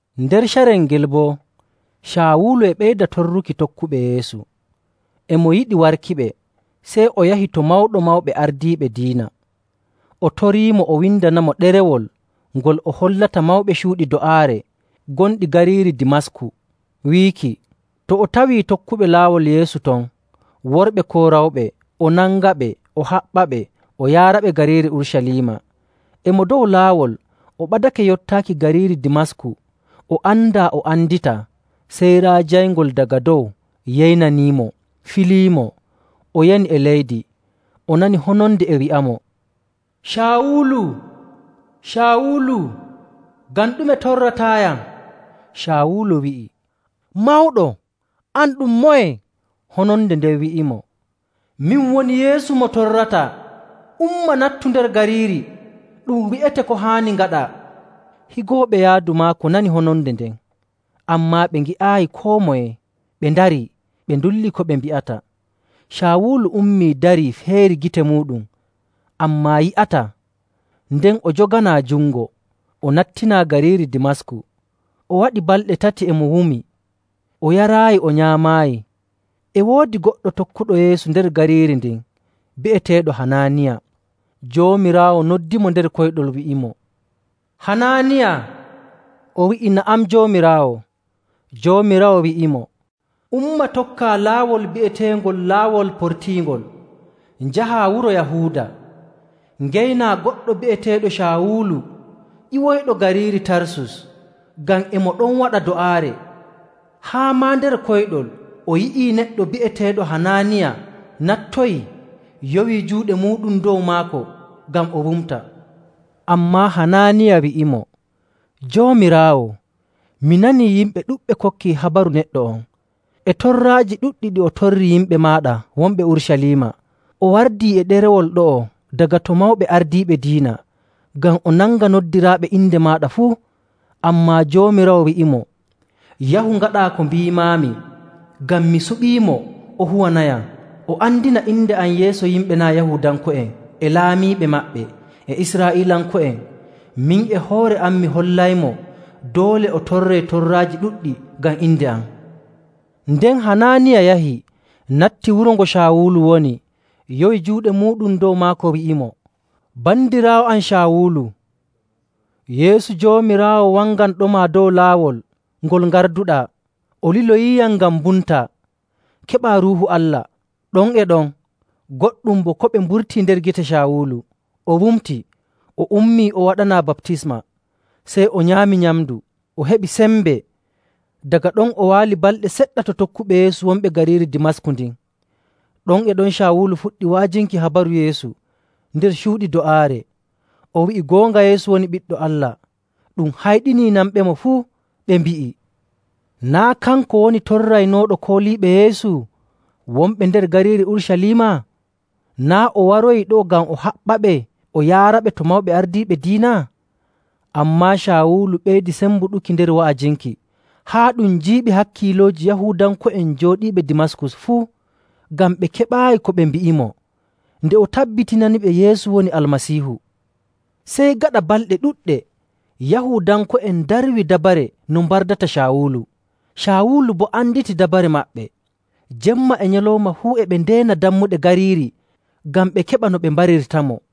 Nder carel ngel boo, Caawulu e ɓeyda torruki tokkuɓe Yeesu, e mo yiɗi warkiɓe. Sey o yahi to Mawɗo Mawɓe Ardiiɓe Diina. O toriimo o windanamo ɗerewol ngol o hollata mawɓe cuuɗi do'aare gonɗi gariiri Dimasku, wiiki to o tawii tokkuɓe Laawol Yeesu ton, worɓe koo rewɓe, o nangaɓe, o haɓɓaɓe, o yaaraɓe gariiri Urucaliima. E mo dow laawol o ɓadake yottaaki gariiri Dimasku, o andaa o anditaa sey raa jayngol daga dow yeynaniimo filiimo. O yani e leydi, o nani hononde e wi'amo, “Caawulu, Caawulu, ngam ɗume torrataayam?” Caawulu wi'i, “Mawɗo, an ɗum moye?” Hononde nden wi'imo, “Min woni Yeesu mo torrataa. Umma nattu nder gariiri. Ɗum wi'ete ko haani ngaɗaa.” Higooɓe yaadu maako nanii hononde nden, ammaa ɓe ngi'aayi koo moye. Ɓe ndarii, ɓe ndulli ko ɓe mbi'ata. Caawulu ummii darii feeri gite muuɗum, ammaa yi'ataa. Nden o joganaa jungo, o nattinaa gariiri Dimasku. O waɗi balɗe tati e mo wumi, o yaraayi o nyaamaayi. E woodi goɗɗo tokkuɗo Yeesu nder gariiri ndin bi'eteeɗo Hanaaniya. Joomiraawo noddimo nder koyɗol, wi'imo, “Hanaaniya!” O wi'i, “Na'am, Joomiraawo.” Joomiraawo wi'imo, “Umma tokkaa laawol bi'eteengol Laawol Portiingol, njahaa wuro Yahuuda, ngeynaa goɗɗo bi'eteeɗo Caawulu ƴiwoyɗo gariiri Tarsus. Ngam e mo ɗon waɗa do'aare, haa maa nder koyɗol o yi'ii neɗɗo bi'eteeɗo Hanaaniya nattoyii, yowii juuɗe muuɗum dow maako ngam o wumta.” Ammaa Hanaaniya wi'imo, “Joomiraawo, mi nanii yimɓe ɗuɗɓe kokkii habaru neɗɗo on, e torraaji ɗuɗɗi ɗi o torri yimɓe maaɗa wonɓe Urucaliima. O wardii e ɗerewol ɗo'o daga to mawɓe ardiiɓe diina, ngam o nanga noddiraaɓe inde maaɗa fuu.” Ammaa Joomiraawo wi'imo, “Yahu ngaɗaa ko mbiimaami, ngam mi suɓiimo o huwanayam, o andina inde am yeeso yimɓe naa' Yahuudanko'en e laamiiɓe maɓɓe, e Israa'iilanko'en. Min e hoore am mi hollaymo doole o torree torraaji ɗuɗɗi ngam inde am.” Nden Hanaaniya yahi, natti wuro ngo Caawulu woni, yowi juuɗe muuɗum dow maako, wi'imo, “Bandiraawo am Caawulu, Yeesu Joomiraawo wanganɗoma dow laawol ngol ngarduɗaa, o liloyiiyam ngam mbumtaa, keɓaa Ruuhu Allah.” Ɗon e ɗon, goɗɗum bo koɓe mburtii nder gite Caawulu. O wumti, o ummii, o waɗanaa baptisma. Sey o nyaami nyamndu, o heɓi sembe. Daga ɗon o waali balɗe seɗɗa to tokkuɓe Yeesu wonɓe gariiri Dimasku ndin. Ɗon e ɗon Caawulu fuɗɗi wa'ajinki habaru Yeesu nder cuuɗi do'aare. O wi'i goonga Yeesu woni Ɓiɗɗo Allah. Ɗum hayɗinii nanɓemo fuu, ɓe mbi'i, “Naa' kanko woni torraynooɗo kooliiɓe Yeesu wonɓe nder gariiri Urucaliima? Naa' o waroyi ɗo'o ngam o haɓɓaɓe o yaaraɓe to mawɓe ardiiɓe diina?” Ammaa Caawulu ɓeydi sembuɗuki nder wa'ajinki, haa ɗum jiiɓi hakkiilooji Yahuudanko'en jooɗiiɓe Dimasku fuu, ngam ɓe keɓaayi ko ɓe mbi'imo nde o tabbitinaniɓe Yeesu woni Almasiihu. Sey gaɗa balɗe ɗuɗɗe, Yahuudanko'en ndarwi dabare no mbardata Caawulu. Caawulu boo anditi dabare maɓɓe. Jemma e nyalawma fuu e ɓe ndeena dammuɗe gariiri ngam ɓe keɓa no ɓe mbarirtamo.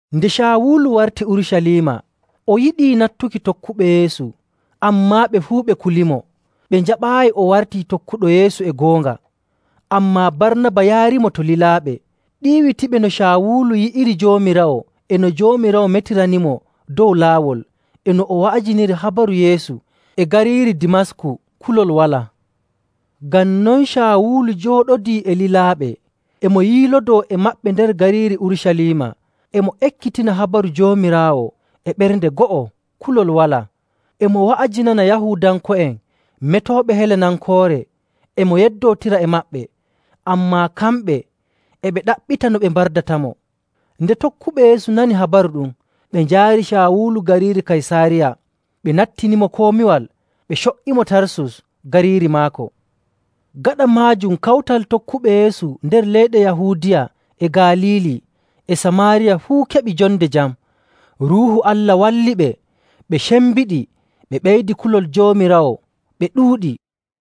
Nde Caawulu warti Urucaliima o yiɗii nattuki tokkuɓe Yeesu, ammaa ɓe fuu ɓe kulimo, ɓe njaɓaayi o wartii tokkuɗo Yeesu e goonga. Ammaa Barnaba yaarimo to lilaaɓe, ɗiiwitiɓe no Caawulu yi'iri Joomiraawo e no Joomiraawo metiranimo dow laawol, e no o wa'ajiniri habaru Yeesu e gariiri Dimasku kulol walaa. Ngam non Caawulu jooɗodii e lilaaɓe, e mo yiilodoo e maɓɓe nder gariiri Urucaliima, e mo ekkitina habaru Joomiraawo e ɓernde go'o, kulol walaa. E mo wa'ajinana Yahuudanko'en metooɓe Helenankoore, e mo yeddootira e maɓɓe, ammaa kamɓe e ɓe ɗaɓɓita no ɓe mbardatamo. Nde tokkuɓe Yeesu nani habaru ɗum, ɓe njaari Caawulu gariiri Kaysaariya. Ɓe nattinimo komiwal ɓe co''imo Tarsus gariiri maako. Gaɗa maajum kawtal tokkuɓe Yeesu nder leyɗe Yahuudiya e Galiili e Samaariya fuu keɓi jonde jam. Ruuhu Allah walliɓe, ɓe cembiɗi, ɓe ɓeydi kulol Joomiraawo, ɓe ɗuuɗi.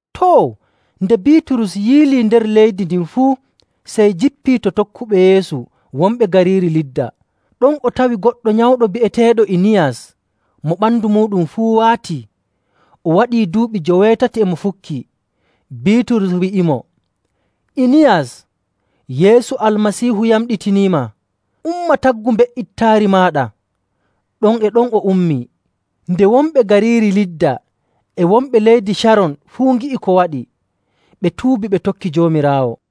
Too, nde Biiturus yiilii nder leydi ndin fuu, sey jippii to tokkuɓe Yeesu wonɓe gariiri Lidda. Ɗon o tawi goɗɗo nyawɗo bi'eteeɗo Iniyas mo ɓandu muuɗum fuu waatii. O waɗii duuɓi joweetati e mo fukkii. Biiturus wi'imo, “Iniyas, Yeesu Almasiihu yamɗitiniima! Umma taggu mbe''itaari maaɗa!” Ɗon e ɗon o ummii. Nde wonɓe gariiri Lidda e wonɓe leydi Caron fuu ngi'i ko waɗi, ɓe tuubi ɓe tokki Joomiraawo.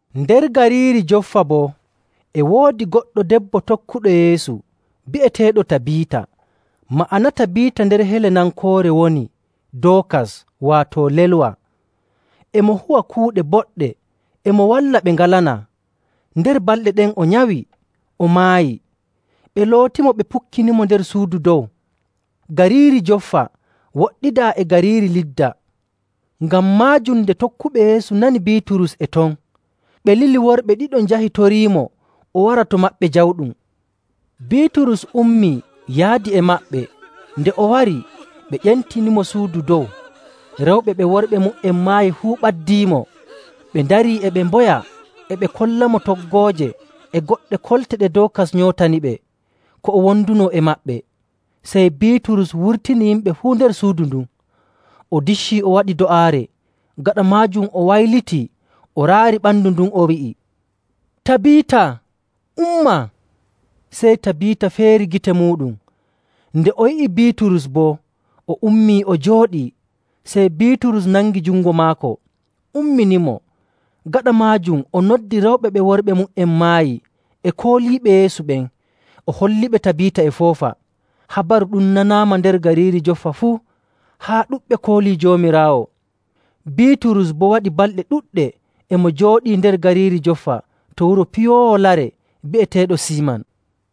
Nder gariiri Joffa boo e woodi goɗɗo debbo tokkuɗo Yeesu bi'eteeɗo Tabiita. (Ma'ana Tabiita nder Helenankoore woni Dookas, waato lelwa.) E mo huwa kuuɗe boɗɗe, e mo walla ɓe ngalanaa. Nder balɗe ɗen o nyawi, o maayi. Ɓe lootimo, ɓe pukkinimo nder suudu dow. Gariiri Joffa woɗɗidaa e gariiri Lidda. Ngam maajum nde tokkuɓe Yeesu nani Biiturus e ton, ɓe lili worɓe ɗiɗo njahi toriimo o wara to maɓɓe jawɗum. Biiturus ummii, yaadi e maɓɓe. Nde o wari, ɓe ƴentinimo suudu dow. Rewɓe ɓe worɓe mu''en maayi fuu ɓaddiimo, ɓe ndarii e ɓe mboya, e ɓe kollamo toggooje e goɗɗe kolte ɗe Dookas nyootaniɓe ko o wondunoo e maɓɓe. Sey Biiturus wurtini yimɓe fuu nder suudu ndun, o diccii o waɗi do'aare. Gaɗa maajum o waylitii o raari ɓandu ndun, o wi'i, “Tabiita, umma!” Sey Tabiita feeri gite muuɗum. Nde o yi'i Biiturus boo, o ummii o jooɗii. Sey Biiturus nangi jungo maako, umminimo. Gaɗa maajum o noddi rewɓe ɓe worɓe mu''en maayi e kooliiɓe Yeesu ɓen, o holliɓe Tabiita e foofa. Habaru ɗum nanaama nder gariiri Joffa fuu, haa ɗuɗɓe koolii Joomiraawo. Biiturus boo waɗii balɗe ɗuɗɗe e mo jooɗii nder gariiri Joffa to wuro piyoowo lare bi'eteeɗo Siiman.